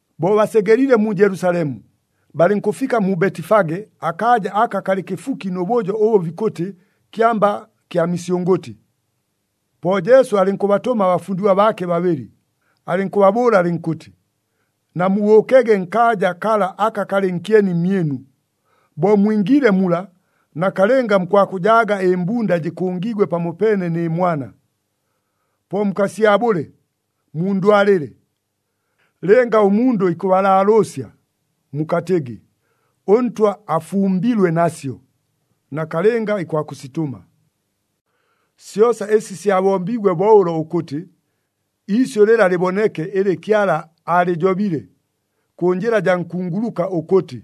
Bo basegeliile mu Jelusalemu, balɨnkʉfika mu Betifage akaaja aka kalɨ kɨfuki nʉ bʉjo ʉbʉ bikʉtɨ Kyamba kya Misyʉngʉtɨ. Po Jesu alɨnkʉbatʉma abafundigwa baake babɨlɨ, alɨnkʉbabʉʉla alɨnkʉtɨ, “Namubʉʉkege nkaaja kala aka kalɨ nkyeni mmyɨnu. Bo mwingiile mula, nakalɨnga mukwakʉjaaga ɨmbunda jɨkʉngiigwe pamopeene nɨ mwana. Po mukasyabʉle, mundwalɨle. Lɨnga ʉmundʉ ikʉbalaalʉʉsya, mukatɨgɨ, ‘ɄNtwa afumbilwe nasyo,’ nakalɨnga ikwakʉsitʉma.” Syosa ɨsi syabombiigwe bo ʉlo ʉkʉtɨ iisyʉ lɨla lɨboneke ɨlɨ Kyala aalɨjobile, kʉ njɨla jaa nkunguluka ʉkʉtɨ,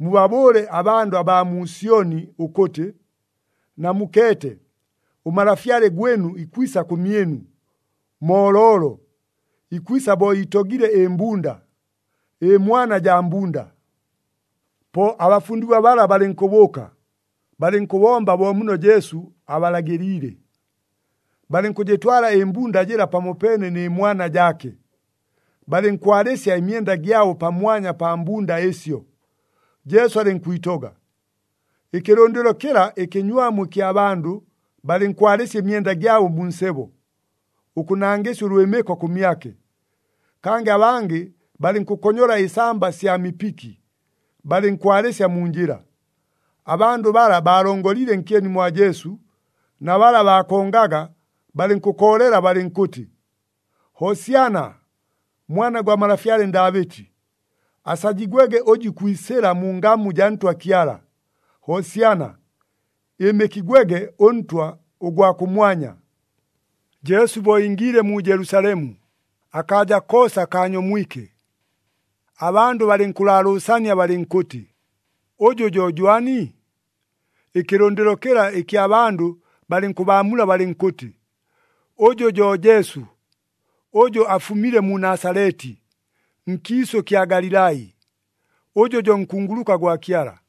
“Mubabʉʉle abandʉ abaa mu Syoni ʉkʉtɨ, ‘Namukeete, ʉMalafyale gwɨnu ikwisa kʉmyɨnu, mooloolo, ikwisa bo iitogile ɨmbunda, ɨmwana jaa mbunda.’” Po abafundigwa bala balɨnkʉbʉʉka, balɨnkʉbomba bo muno Jesu abalagɨliile. Balɨnkʉjɨtwala ɨmbunda jɨla pamopeene nɨ mwana jaake, balɨnkwalɨsya ɨmyenda gyabo pamwanya pa mbunda ɨsyo, Jesu alɨnkwitoga. Ɨkɨlʉndɨlo kɨla ɨkɨnywamu ɨkya bandʉ balɨnkwalɨsya ɨmyenda gyabo mu nsebo, ʉkʉnangɨsya ʉlwɨmɨko kʉmyake, kangɨ abangɨ balɨnkʉkonyola ɨsamba sya mipiki, balɨnkwalɨsya mu njɨla. Abandʉ bala baalongoliile nkyeni mwa Jesu na bala baakongaga balɨnkʉkoolela balɨnkʉtɨ, “Hosyana! Mwana gwa malafyale Ndaabɨti! Asajigwege ʉjʉ ikwisɨla mu ngamu jaa Ntwa Kyala! Hosyana! Ɨɨmɨkigwege ʉNtwa ʉgwa kʉmwanya!” Jesu bo ingiile mu Jelusalemu, akaaja koosa kaanyomwike. Abandʉ balɨnkʉlaalʉʉsania balɨnkʉtɨ, “Ʉjʉ jo jwani?” Ɨkɨlʉndɨlo kɨla ɨkya bandʉ balɨnkʉbaamula balɨnkʉtɨ, “Ʉjʉ jo Jesu, ʉjʉ afumile mu Nasaleti, nkiisʉ kya Galilai, ʉjʉ jo nkunguluka gwa Kyala.”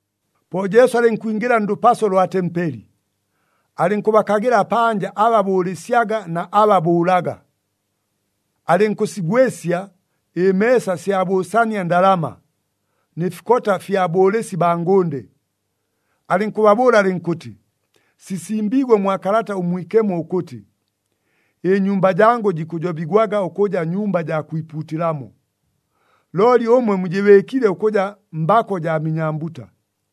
Po Jesu alɨnkwingɨla ndʉpaso lwa tempeli, alɨnkʉbakagɨla panja aba bʉʉlɨsyaga na aba bʉʉlaga. Alɨnkʉsigwɨsya ɨmeesa sya bʉʉsania ndalama, nɨ fikota fya bʉʉlɨsi baa ngʉnde. Alɨnkʉbabʉʉla alɨnkʉtɨ, “Sisimbiigwe mwa Kalata ʉMwikemo ʉkʉtɨ, ‘Ɨnyumba jangʉ jikʉjobigwaga ʉkʉja nyumba jaa kwipuutɨlamo.’ Looli ʉmwe mujɨbɨɨkile ʉkʉja, ‘Mbako jaa minyambuta.’”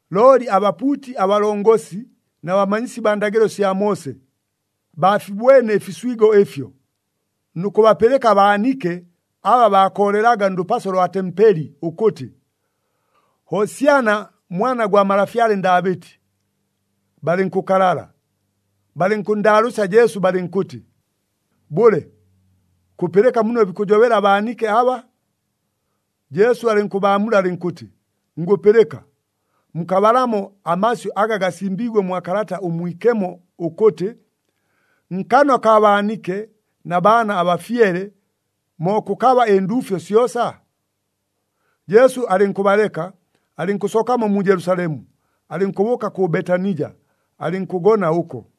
Looli abapuuti abalongosi na bamanyisi baa ndagɨlo sya Moose, baafibwene ɨfiswigo ɨfyo, nʉ kʉbapɨlɨka abaanike aba baakoolelaga ndʉpaso lwa tempeli ʉkʉtɨ, “Hosyana, Mwana gwa malafyale Ndaabɨti,” balɨnkʉkalala. Balɨnkʉnndaalʉʉsya Jesu balɨnkʉtɨ, “Bʉle, kʉpɨlɨka muno bikʉjobela abaanike aba?” Jesu alɨnkʉbaamula alɨnkʉtɨ, “Ngʉpɨlɨka. Mukabalamo amasyʉ aga gasimbiigwe mwa Kalata ʉMwikemo ʉkʉtɨ, ‘Nkanwa kaa baanike na baana abafyele, mo kʉkaba ɨnduufyo syosa?’” Jesu alɨnkʉbaleka, alɨnkʉsookamo mu Jelusalemu, alɨnkʉbʉʉka kʉ Betanija, alɨnkʉgona ʉko.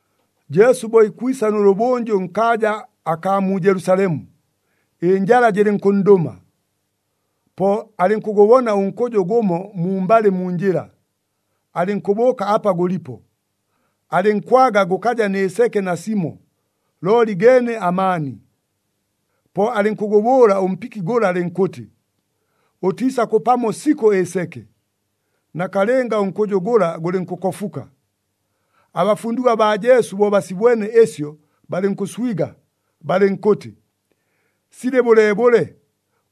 Jesu bo ikwisa nʉlʉbʉnjʉ nkaaja akaa mu Jelusalemu, ɨnjala jɨlɨnkʉnndʉma. Po alɨnkʉgʉbona ʉnkʉjʉ gʉmo mumbalɨ mu njɨla, alɨnkʉbʉʉka apa gʉlipo, alɨnkwaga gʉkaja nɨ seke nasimo, looli geene amaani. Po alɨnkʉgʉbʉʉla ʉmpiki gʉla alɨnkʉtɨ, “Ʉtiisakʉpamo sikʉ ɨseke!” Nakalɨnga ʉnkʉjʉ gʉla gʉlɨnkʉkofuka. Abafundigwa baa Jesu bo basibwene ɨsyo, balɨnkʉswiga, balɨnkʉtɨ, “Silɨ bʉleebʉle,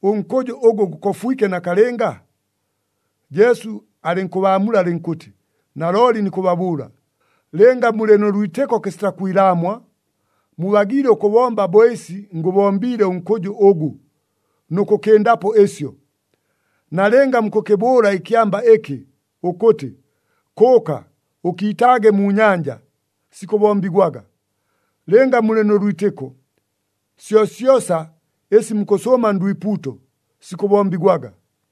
ʉnkʉjʉ ʉgʉ gʉkofwike nakalɨnga?” Jesu alɨnkʉbaamula alɨnkʉtɨ, “Nalooli nikʉbabʉʉla, lɨnga mulɨ nʉ lwitɨko kɨsita kwilaamwa, mubagiile ʉkʉbomba bo ɨsi ngʉbombiile ʉnkʉjʉ ʉgʉ, nʉ kʉkɨndapo ɨsyo. Nalɨnga mukʉkɨbʉʉla ɨkyamba ɨkɨ, ʉkʉtɨ, ‘Kʉʉka ʉkiitaage mu nyanja,’ sikʉbombigwaga. Lɨnga mulɨ nʉ lwitɨko, syosyosa ɨsi mukʉsʉʉma ndwipuuto, sikʉbombigwaga.”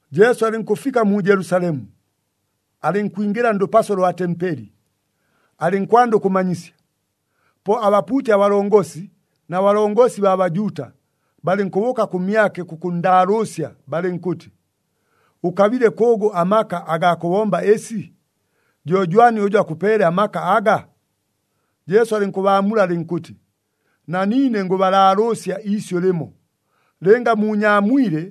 Jesu alɨnkʉfika mu Jelusalemu, alɨnkwingɨla ndʉpaso lwa tempeli, alɨnkwanda ʉkʉmanyisya. Po abapuuti abalongosi na balongosi baa Bajuuta, balɨnkʉbʉʉka kʉmyake kʉkʉnndaalʉʉsya balɨnkʉtɨ, “Ʉkabile kʉʉgʉ amaka agaa kʉbomba ɨsi? Jo jwani ʉjʉ akʉpeele amaka aga?” Jesu alɨnkʉbaamula alɨnkʉtɨ, “Na niine ngʉbalaalʉʉsya iisyʉ lɨmo. Lɨnga muunyaamwile,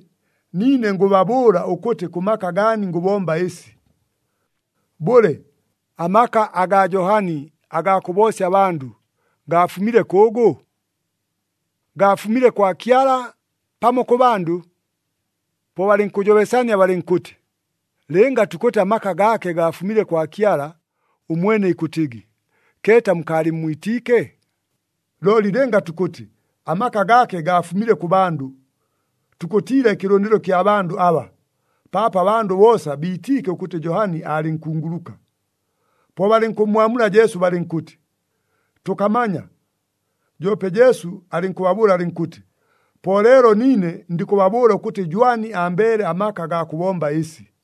niine ngʉbabʉʉla ʉkʉtɨ kʉ maka gaani ngʉbomba ɨsi. Bʉle, amaka agaa Johani agaa kʉboosya abandʉ gaafumile kʉʉgʉ? Gaafumile kwa Kyala, pamo kʉ bandʉ?” Po balɨnkʉjobesania balɨnkʉtɨ, “Lɨnga tukʉtɨ amaka gaake gaafumile kwa Kyala, ʉmwene ikʉtɨgɨ, ‘Keeta mukaalɨmmwitiike?’ Looli lɨnga tukʉtɨ amaka gaake gaafumile kʉ bandʉ, tukʉtiila ɨkɨlʉndɨlo kya bandʉ aba, paapo abandʉ boosa biitiike ʉkʉtɨ Johani aalɨ nkunguluka.” Po balɨnkʉmmwamula Jesu balɨnkʉtɨ, “Tʉkamanya.” Joope Jesu alɨnkʉbabʉʉla alɨnkʉtɨ, “Po leelo niine, ndikʉbabʉʉla ʉkʉtɨ jwani ambeele amaka agaa kʉbomba ɨsi.”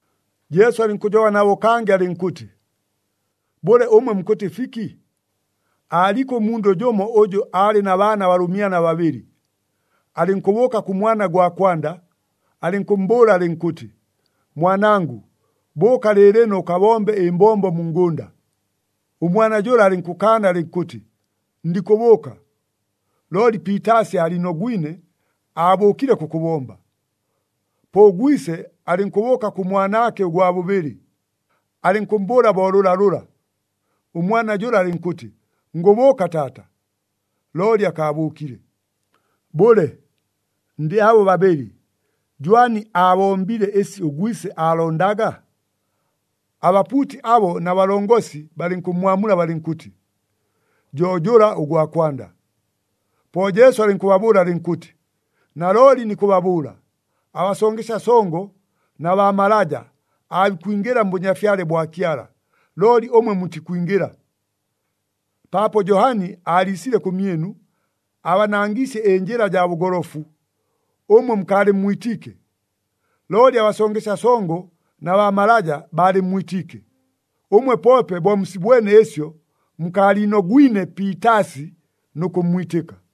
Jesu alɨnkʉjoba nabo kangɨ alɨnkʉtɨ, “Bʉle, ʉmwe mukʉtɨ fiki? Aaliko ʉmundʉ jʉmo ʉjʉ aalɨ na baana abalʉmyana babɨlɨ. Alɨnkʉbʉʉka kʉ mwana gwa kwanda, alɨnkʉmmbʉʉla alɨnkʉtɨ, ‘Mwanangʉ, bʉʉka lɨɨlɨno ʉkabombe ɨmbombo mu ngʉnda.’ Ʉmwana jʉla alɨnkʉkaana alɨnkʉtɨ, ‘Ndikʉbʉʉka.’ Looli piitaasi aaliinogwine, aabʉʉkile kʉkʉbomba. Po ʉgwise alɨnkʉbʉʉka kʉ mwanaake ʉgwa bʉbɨlɨ, alɨnkʉmmbʉʉla bo lʉlalʉla. Ʉmwana jʉla alɨnkʉtɨ, ‘Ngʉbʉʉka taata.’ Looli akaabʉʉkile. Bʉle, ndɨ abo babɨlɨ, jwani aabombile ɨsi ʉgwise aalondaga?” Abapuuti abo na balongosi balɨnkʉmmwamula balɨnkʉtɨ, “Jo jʉla ʉgwa kwanda.” Po Jesu alɨnkʉbabʉʉla alɨnkʉtɨ, “Nalooli nikʉbabʉʉla, abasongesya songo na baa malaja aabikwingɨla mBʉnyafyale bwa Kyala, looli ʉmwe mutikwingɨla. Paapo Johani aaliisile kʉmyɨnu, aabanangiisye ɨnjɨla jaa bʉgolofu, ʉmwe mukaalɨmmwitiike. Looli abasongesya songo na baa malaja baalɨmmwitiike. Ʉmwe poope bo musibwene ɨsyo, mukaaliinogwine piitaasi nʉ kʉmmwitɨka.”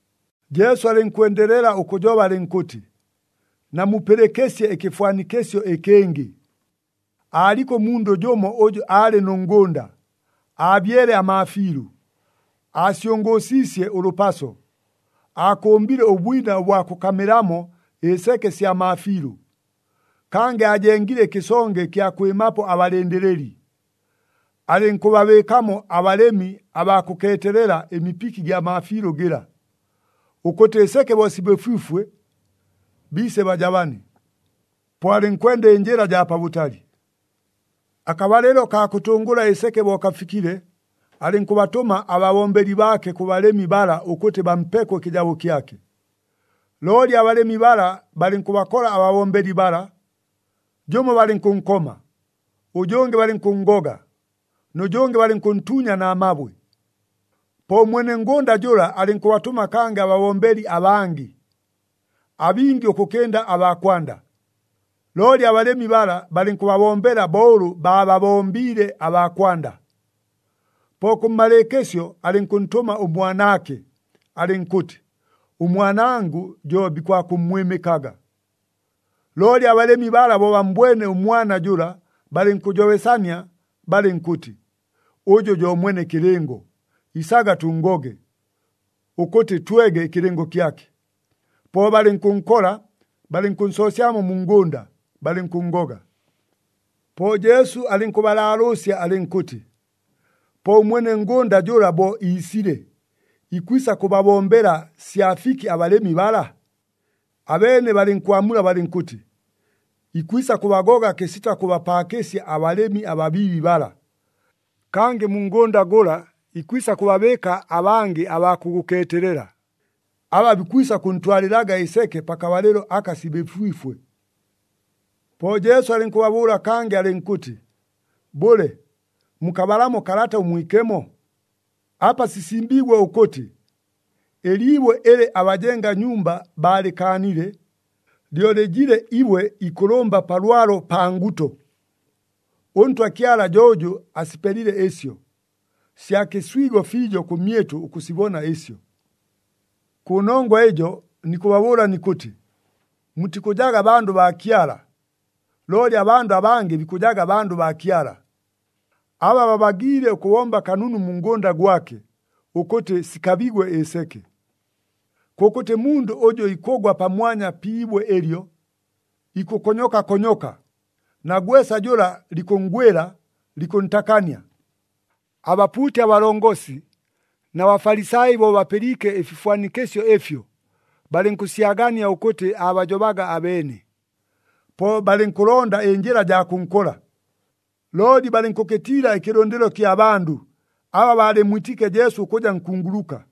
Jesu alɨnkwendelela ʉkʉjoba alɨnkʉtɨ, “Namupɨlɨkɨsye ɨkɨfwanikɨsyo ɨkɨngɨ. Aaliko ʉmundʉ jʉmo ʉjʉ aalɨ nʉ ngʉnda. Aabyele amaafiilʉ, aasyʉngʉʉsiisye ʉlʉpaso, aakʉmbile ʉbwina ʉbwa kʉkamɨlamo ɨseke sya maafiilʉ, kangɨ aajengile ɨkɨsonge ɨkya kwɨmapo abalɨndɨlɨli. Alɨnkʉbabɨɨkamo abalɨmi abaa kʉkeetelela ɨmipiki gya maafiilʉ gɨla, ʉkʉtɨ ɨseke bo sibɨfwifwe, biise bajabane. Po alɨnkwenda ɨnjɨla jaa pabʉtali. “Akabalɨlo kaa kʉtʉngʉla ɨseke bo kafikile, alɨnkʉbatʉma ababombeli baake kʉ balɨmi bala ʉkʉtɨ bampeko ɨkɨjabo kyake. Looli abalɨmi bala balɨnkʉbakola ababombeli bala, jʉmo balɨnkʉnkoma, ʉjʉngɨ balɨnkʉnngoga, nʉ jʉngɨ balɨnkʉntuunya na mabwe. Po ʉmwene ngʉnda jʉla alɨnkʉbatʉma kangɨ ababombeli abangɨ, abingi ʉkʉkɨnda aba kwanda, looli abalɨmi bala balɨnkʉbabombela bo ʉlʉ baababombiile abaa kwanda. Po kʉmmalɨɨkɨsyo alɨnkʉntʉma ʉmwanaake, alɨnkʉtɨ, ‘Ʉmwanangʉ jo bikwakʉmmwɨmɨkaga.’ Looli abalɨmi bala bo bammbwene ʉmwana jʉla, balɨnkʉjobesania balɨnkʉtɨ, ‘Ʉjʉ jo mwene kɨlɨngo. Isaga tʉnngoge, ʉkʉtɨ twege ɨkɨlɨngo kyake.’ Po balɨnkʉnkola, balɨnkʉnsoosyamo mu ngʉnda, balɨnkʉnngoga.” Po Jesu alɨnkʉbalaalʉʉsya alɨnkʉtɨ, “Po ʉmwene ngʉnda jʉla bo iisile, ikwisa kʉbabombela sya fiki abalɨmi bala?” Abeene balɨnkwamula balɨnkʉtɨ, “Ikwisa kʉbagoga kɨsita kʉbapaakɨsya abalɨmi ababiibi bala, kangɨ mu ngʉnda gʉla ikwisa kʉbabɨɨka abangɨ abaa kʉgʉkeetelela, aba bikwisa kʉntwalɨlaga ɨseke pakabalɨlo aka sibɨfwifwe.” Po Jesu alɨnkʉbabʉʉla kangɨ alɨnkʉtɨ, “Bʉle, mukabalamo Kalata ʉMwikemo? Apa sisimbiigwe ʉkʉtɨ, ‘Ɨliibwe ɨlɨ abajenga nyumba baalɨkaanile, lyo lɨjile ibwe ikʉlʉmba pa lwalo, pa nguto. ɄNtwa Kyala jo ʉjʉ asipelile ɨsyo, sya kɨswigo fiijo kʉmyɨtʉ ʉkʉsibona ɨsyo.’ “Kʉnongwa ɨjo, nikʉbabʉʉla nikʉtɨ, mutikʉjaga bandʉ baa Kyala, looli abandʉ abangɨ bikʉjaga bandʉ baa Kyala, aba babagiile ʉkʉbomba kanunu mu ngʉnda gwake, ʉkʉtɨ sikabigwe ɨseke. Kʉkʉtɨ mundʉ ʉjʉ ikʉgwa pamwanya pi ibwe ɨlyo, ikʉkonyoka konyoka, na gwesa jʉla likʉnngwɨla, likʉntakania.” Abapuuti abalongosi na Bafalisai bo bapɨliike ɨfifwanikɨsyo ɨfyo, balɨnkʉsyagania ʉkʉtɨ aabajobaga abeene. Po balɨnkʉlonda ɨnjɨla jaa kʉnkola, looli balɨnkʉkɨtiila ɨkɨlʉndɨlo kya bandʉ, aba baalɨmmwitiike Jesu ʉkʉja nkunguluka.